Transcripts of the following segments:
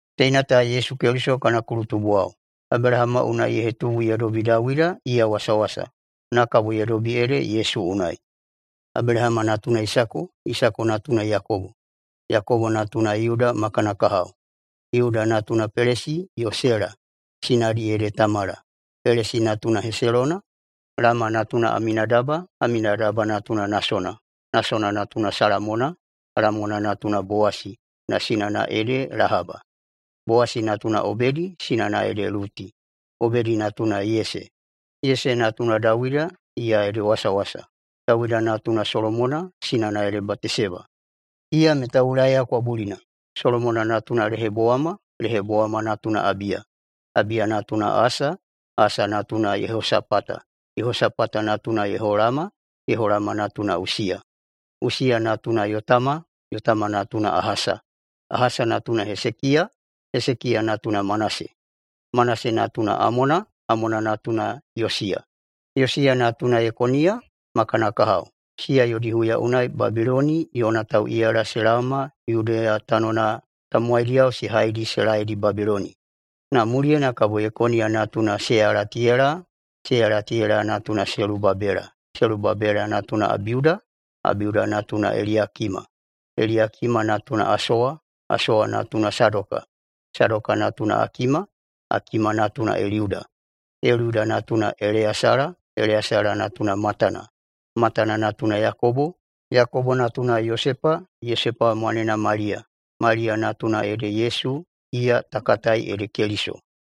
ZTeina ta Yesu Keliso kana kulutubuwao. Abelahama unai ye hetubu ye dobi Dawida iya wasawasa, na kabo ye dobi ede Yesu unai. Abelahama natuna Isako, Isako natuna Yakobo, Yakobo natuna Yuda ma kana kahao. Yuda natunao Pelesi yo Sela, sinadi ede Tamala. Pelesi natuna Heselona, Heselona natuna Lama. Lama natuna Aminadaba, Aminadaba natuna Nasona, Nasona natuna Salamona. Salamona natuna Bowasi, na sinana ede Lahaba. Bowasi natuna Obedi, sinana ede Luti. Obedi natuna Yese, Yese natuna Dawida, iya ede wasawasa. Dawida natuna Solomona, sinana ede Bateseba, iya meta Ulaiya kwabulina. Solomona natuna Lehobowama, Lehobowama natuna Abiya, Abiya natuna Asa. Asa natuna Yehosapata, Yehosapata natuna Yeholama, Yeholama natuna Usiya. Usiya natuna Yotama, Yotama natuna Ahasa, Ahasa natuna Hesekiya. Hesekiya natuna Manase, Manase natuna Amona, Amona natuna Yosiya. Yosiya natuna Yekoniya ma kana kahao. Siya yodi huya unai Babiloni yona tauꞌiyala se laoma Yudeya tanona tamowaidiyao se haidi se laeidi Babiloni. Na muliyena kabo Yekoniya natuna Seyalatiyela, Seyalatiyela natuna Selubabela. Selubabela natuna Abiuda, Abiuda natuna Eliyakima, Eliyakima natuna Asowa. Asowa natuna Sadoka, Sadoka natuna Akima, Akima natuna Eliuda, Eliuda natuna Eleyasala, Eleyasala natuna Matana, Matana natuna Yakobo, Yakobo natuna Yosepa. Yosepa mwanena Maliya. Maliya natuna ede Yesu, iya ta katai ede Keliso.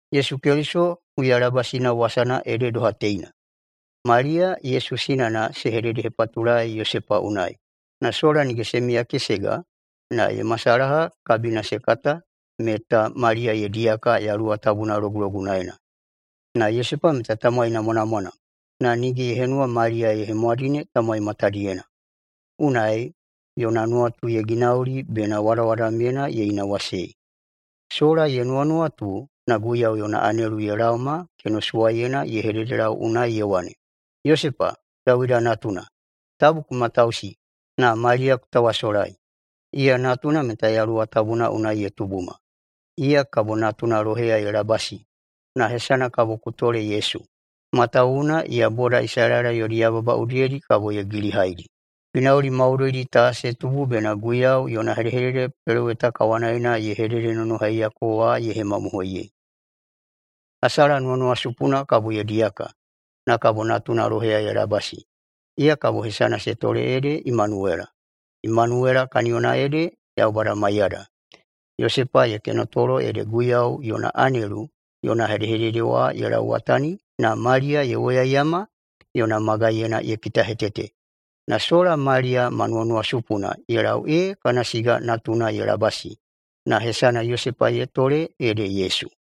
Yesu Keliso huyalabasina wasana ede doha teina: Maliya Yesu sinana se hededehepatulaei Yosepa unai, na sola nige se miyakesega, na ye masalaha na kabina se kata meta Maliya ye diyaka Yaluwa Tabuna logulogunaena. Na Yosepa meta tamowai namwanamwana na nige ye henuwa Maliya ye hemwadine tamowai matadiyena. Unai yona nuwatu ye ginauli bena wadawadamyena ye inawasei. Sola ye nuwanuwatu, na Guiyau yona anelu ye laoma kenosuwaiyena ye hededelau unai ye wane, “Yosepa, Dawida natuna, tabu ku matausi na Maliya ku tawasolai. Iya natuna meta Yaluwa Tabuna unai ye tubuma. Iya kabo natuna loheya ye labasi, na hesana kabo ku tole Yesu, matawuwuna iya boda Isalaela yodi yababa udiyedi kabo ye gilihaidi.” Ginauli maudoidi ta se tubu bena Guiyau yona hedehedede peloweta kawanaena ye hededenonohaiyako wa ye hemamohoiyei: “Hasala nuwanuwasupuna kabo ye diyaka, na kabo natuna loheya ye labasi. Iya kabo hesana se tole ede Emanuwela.” Emanuwela kaniyona ede Yaubada maiyada. Yosepa ye kenotolo ede Guiyau yona anelu yona hedehedede wa ye lauwatani na Maliya ye woyaiyama yona magaiyena ye kitahetete. Na sola Maliya ma nuwanuwasupuna ye lau ee kana siga natuna ye labasi. Na hesana Yosepa ye tole ede Yesu.